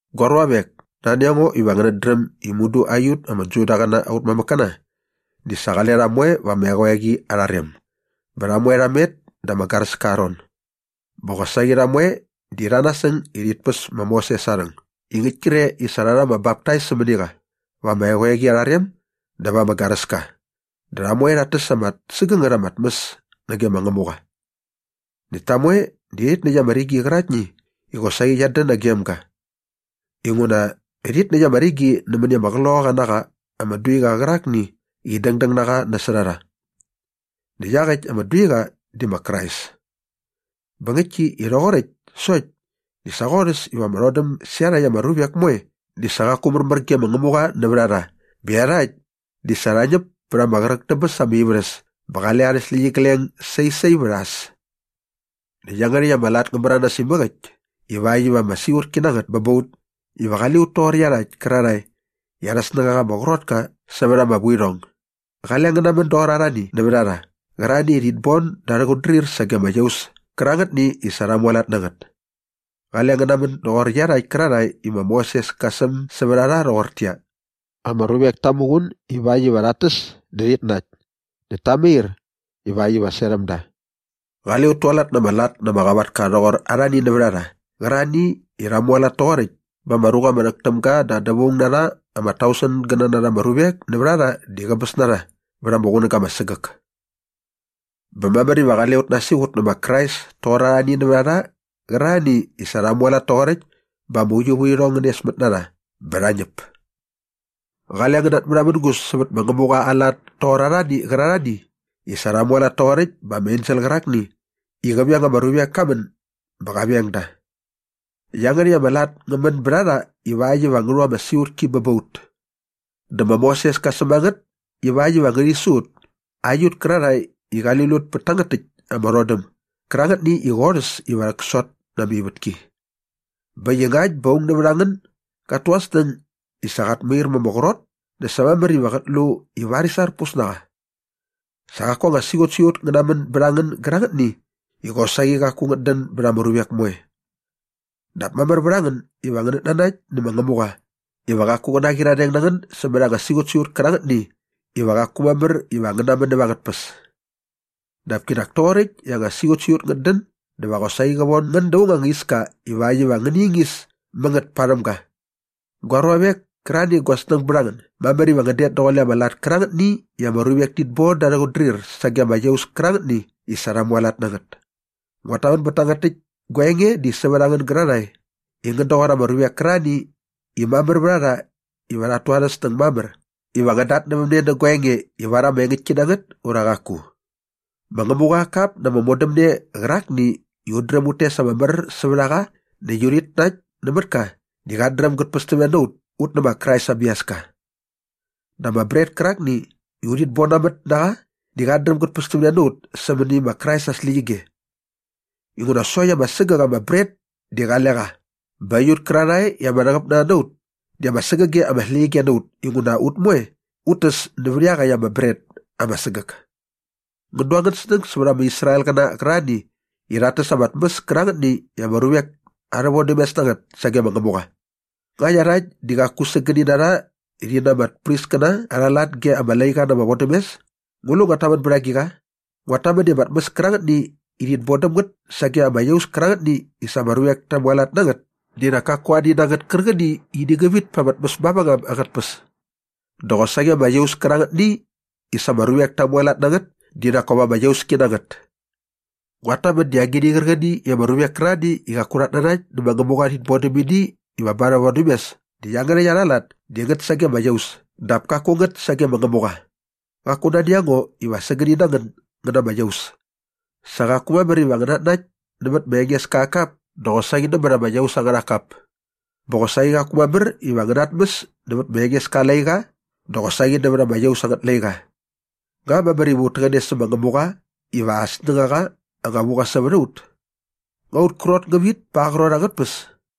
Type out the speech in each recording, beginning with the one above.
Gua ruavek, nani a ngo iva ngänät dräm i mudu aiut ama Judaqäna aut mamäkkäna di sa qale rha moe va ama eqoeqi arha rem bä rha moe rha met da ama garäska aa ron. Bä qosaqi rha moe di rha nasäng i rhit päs ma Moses aa rhäng i ngäkt kre i sa rha rha ama baptais sämäni qa va ama eqoeqi arha rem dä va ama garäska dä rha moe rhat täs ama sägängät ama tmäs nage ma Ngämuqa. Näkt ta moe rhit näkt ama rigi qäraktni i qosaqi qiat dän nagem ga. Inguna rhit näkt ama rigi nämäni ama qloqaqa na qa ama duiqa qärakni i dängdäng na qa nasot a rha. Näkt iaqäkt ama duiqa di ma Krais. Bä ngäktki i rhoqoräkt sokt di sa qorhäs iva ama rhodäm sä iarhakt ama ruvek moe di sa qaku märmär ge ma Ngämuqa nävät a rha bä iarhakt di sa rha ñäp pät ama qräk dä bäs ama ivärhäs bä qale arhä släqyigleng sai sai vät a äs. Näkt iangärhäkt ama lat ngä märanas imäk äkt ivakt iva ama siqutki na ngät bä ba ut iva qale ut toqor ta iarhakt kärarhae i arhä snängaqa ama qrot ka sävät ama vuirhong. Qale ngän namän doqor arhani nävät a rha qärarhani i rhit bon da arhä qutdrir sage ama iaus kärangätni i sa rha mualat na ngät. Qale ngän namän doqor iarhakt kärarhae i ma Moses ka säm sävät a rha rhoqortäqyia, “Ama ruvek ta muqun ivakt iva rhat täs dä rhit nakt näkt ta mair ivakt iva serhäm da.” Qale ut tualat na ama lat na ama qavatka rhoqor arhani nävät a rha qärarhani i rha mualat toqoräkt bä ama ruqa ama rhäk täm ga da dävaung na rha ama tausengäna na ama ruvek nävät a rha di sa qäbäs na rha vät ama qunäga ama sägäk. Bä mamär iva qale ut nasiqut nä ma Krais toqor arhani nävät a rha qärarhani i sa rha mualat toqoräkt bä ama uiuvärhirhong ngä nesmät na rha bä rha ñäp. Qale ngän natmärhamängus sävät ma Ngämuqa aa lat toqor arhani qärarhani i sa rha mualat toqoräkt bä ama ensel qärakni i qä veng ama ruvek ka män bä qa veng da. Iangärhäkt ama lat ngä män bät a rha ivakt iva ngä rhu ama siqutki bä ba ut. Dä ma Moses ka säm a ngät ivakt iva ngärhi su ut aiut kärarhae i qali lut pät tangät täkt ama rhodäm gärangätni i qorhäs iva rhäksot na ama ivätki. Bä äkt i ngakt bä aung nävät a ngän gat tu aa snäng i sa qat mair ma ama qrot dä sa mamär iva qät lu i varis arpus na qa. Sa qaku anga siqutsiqut ngä män bät a ngän gärangätni i qosaqi qaku ngät dän bät ama ruvek moe. Dap mamär vät a ngän iva ngänät nanakt nä ma Ngämuqa iva qaku qä naqyiradeng na ngän sämät anga siqutsiqut kärangätni iva qaku mamär iva ngän namän näva angät tpäs. Dap kinak toqoräkt i anga siqutsiqut ngät dän dä va qosaqi qä von ngän da aung anga iska ivakt iva ngäni ingis mä ngät parhäm ga. Gua ruavek kärarhani i gua snäng bät a ngän, mamär iva ngän det daqule ama lat kärangätni i ama ruvek tit bon da arhä qutdrir sage ama iaus kärangätni i sa rha mualat na ngät. Nguat tamän bät tangät täkt gua enge di sävät a ngän gärarhae i ngän doqor ama ruvek kärarhani i mamär vät a rha iva rhat tu arhä snäng mamär iva ngän datnävämne nä gua enge ivar ama engäktni na ngät ura qaku. Ma Ngämuqa aa kap na ama modämne qärakni i ut dräm ut tes ama mär sävät a qa näkt urhit nakt nämät ka di qat dräm gät pästämne na ut ut nä ma Krais aa biaska. Dä ama bret kärakni i urhit bonamät na qa di qat dräm gät pästämne na ut sämäni ma Krais aa släqyige. Inguna sokt ama sägäk ama bret di qale qa bä aiut kärarhae i ama rhäqäp na rha na ut di ama sägäge ama släqyige na ut inguna ut moe ut täs nävät iaqäkt ama bret ama sägäk. Ngän du angän snäng sävät ama Israelqäna qärarhani i rhat täs ama tmäs kärangätni i ama ruvek arhä vodämes na ngät sage ma Ngämuqa. Nga iarhakt di qaku sägäni na rha rhi na ama priskäna arha lat ge ama laiqa na ama vodämes? Ngu lu nguat tamän bät agiqa? Nguat tamän i ama tmäs kärangätni i rhit bon däm ngät sage ama iaus kärangätni i sa ama ruvek ta mualat na ngät di nak kaku ani na ngät kärqäni i ini ngä vit pät ama tmäs mavängam angät tpäs. Dä qosaqi ama iaus kärangätni i sa ama ruvek ta mualat na ngät di nak kop ama iauski na ngät. Nguat tamän di agini qärqäni i ama ruvek kärarhani i qaku rhat nanakt nä ma Ngämuqa rhit bon däm ini iva ba arhä vodämes di iangärhäkt arha lat di ngät sage ama iaus dap kaku ngät sage ma Ngämuqa. Qaku nani a ngo iva sägäni na ngän ngän na ama iaus. Sa qaku mamär iva ngän natnakt nämät ma Engeska aa kap dä qosaqi nämät ama iaus angärha kap. Bä qosaqi qaku mamär iva ngän natmäs nävät ma Engeska aa laiqa dä qosaqi nävät ama iaus angät laiqa. Nga mamär iva ut täqäne sä ma Ngämuqa iva aa anga snängaqa anga vu qa sävät a ut? Nga aut krot ngä vit pa aa qrot angät tpäs?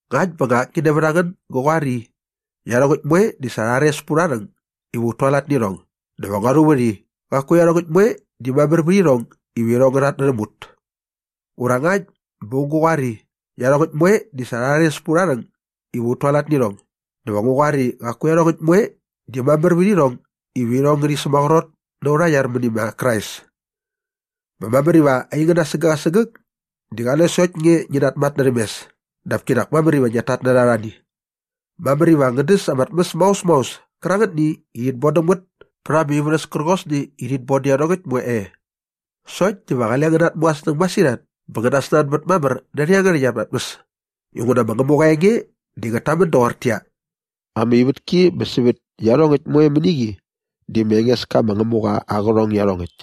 Ngakt bä akni nävät a ngän gä qoar i, “Iarhongäkt moe di sa rha rhares pät aurha rhäng iva ut tualat nä irhong” dä va ngua rhuvät i, “Qaku iarhongäkt moe di mamär vät irhong iva irhong ngä rhatnärhäm ut.” Ura ngakt bä aung gä qoar i, “Iarhongäkt moe di sa rha rhares pät aurha rhäng iva ut tualat nä irhong” dä va ngu qoar i qaku iarhongäkt moe di mamär vät irhong iva irhong ngärhi sämaqrot nä aurha iar mäni ma Krais. Bä mamär iva aingän asägäk asägäk di qale sokt nge ngi namatnärhäm mes dap kinak mamär iva ngiat tatnärha arhani. Mamär iva ngän däs ama släkt maos maos kärangätni i rhit bodäm ngät pät ama ivärhäs kärqosni i rhit bodä iarhongäkt moe e. Sokt diva qale ngän natmu angän snäng masirhat bä ngän nasnanbät mamär närhä iangärhäkt ama tmäs inguna ma Ngämuqa aa enge di ngät tamän doqortäqyia, “Ama ivätki bä sävät iarhongäkt moe mäni qi di ma Engeska ma Ngämuqa aa qärhong iarhongäkt.”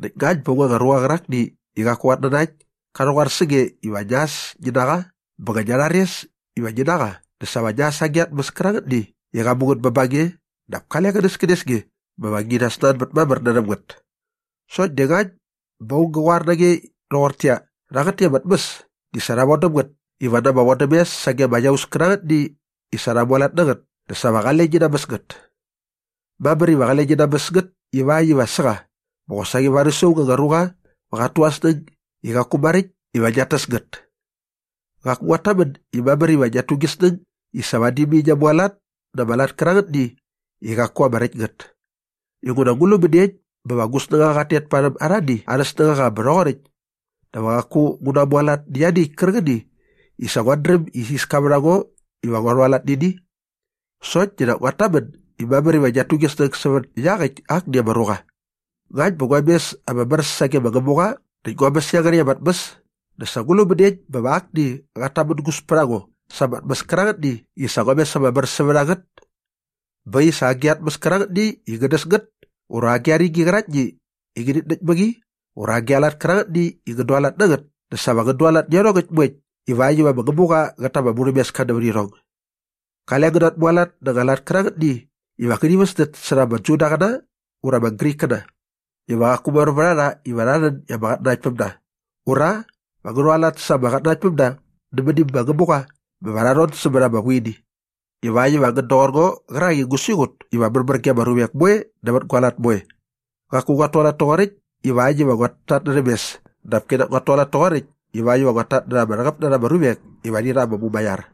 Näkt ngakt bä aung anga ruqa qärakni i qaku qat nanakt ka rhäqoar sä nge iva ngia äs ngi na qa bä ngia rhares iva ngi na qa dä sa va ngia äs agi a tmäs kärangätni i qa mu ngät bä ba nge dap kale qänäskänes nge bä va ngi nasnanbät mamär närhäm ngät. Sokt di ngakt bä aung gä qoar na nge rhoqortäqyia, “Rhangät täkt ama tmäs di sa rha von däm ngät iva na ama vodämes sage ama iaus kärangätni i sa rha mualat na ngät” dä sa va qale ngi namäs ngät. Mamär iva qale ngi namäs ngät ivakt iva sä qa bä qosaqi varis aung anga ruqa va qat tu aa snäng i qaku maräkt iva ngiat täs ngät. Qaku nguat tamän i mamär iva ngiat tu gi snäng i sa vadi mai ngia mualat na ama lat kärangätni i qaku ama räkt ngät. Inguna ngu lu mäniekt bä va gu snängaqa qat tet parhäm arhani arhä snängaqa bä rhoqoräkt dä va qaku ngu namualat nä ianiäkt kärqäni i sa nguat dräm i isiska vät a ngo iva ngua rhualat nä ini? Sokt di nak nguat tamän i mamär iva ngiat tu gi snäng sävät iaqäkt akni ama ruqa. Ngakt bä ngua mes ama mär sage ma Ngämuqa näkt ngua mäs iangärhäkt ama tmäs dä sa ngu lu mäniekt bä va akni qat tamängus pät a ngo sa ama tmäs kärangätni i sa ngua mes ama mär sävät a ngät? Bä äkt i sa agi a tmäs kärangätni i ngän däs ngät ura agi a rigi qäraktni i ngänit näkt mä qi ura agi a lat kärangätni i ngän dualat na ngät dä sa va ngän dualat nä iarhongäkt moekt ivakt iva ma Ngämuqa qät ta ama murhämeska nävät irhong. Qale ngän natmualat na anga lat kärangätni iva ngärhi väsdät särha ama Judaqäna ura ama Grikkäna iva qaku mamär vät a rha iva rha rhän i ama qatnanaktpämda ura va ngä rhualat sa ama qatnanaktpämda mäni ma Ngämuqa bä va rha rhon sämät ama vuini ivakt iva ngän doqor ngo qärak i ngu siqut iva märmär ge ama ruvek moe nävät gua lat moe. Qaku nguat tualat toqoräkt ivakt iva nguat tatnärhäm mes dap kinak nguat tualat toqoräkt ivakt iva nguat tatnärha ama rhäqäp na rha ama ruvek ivakt iva rhi rha ama mumaiar.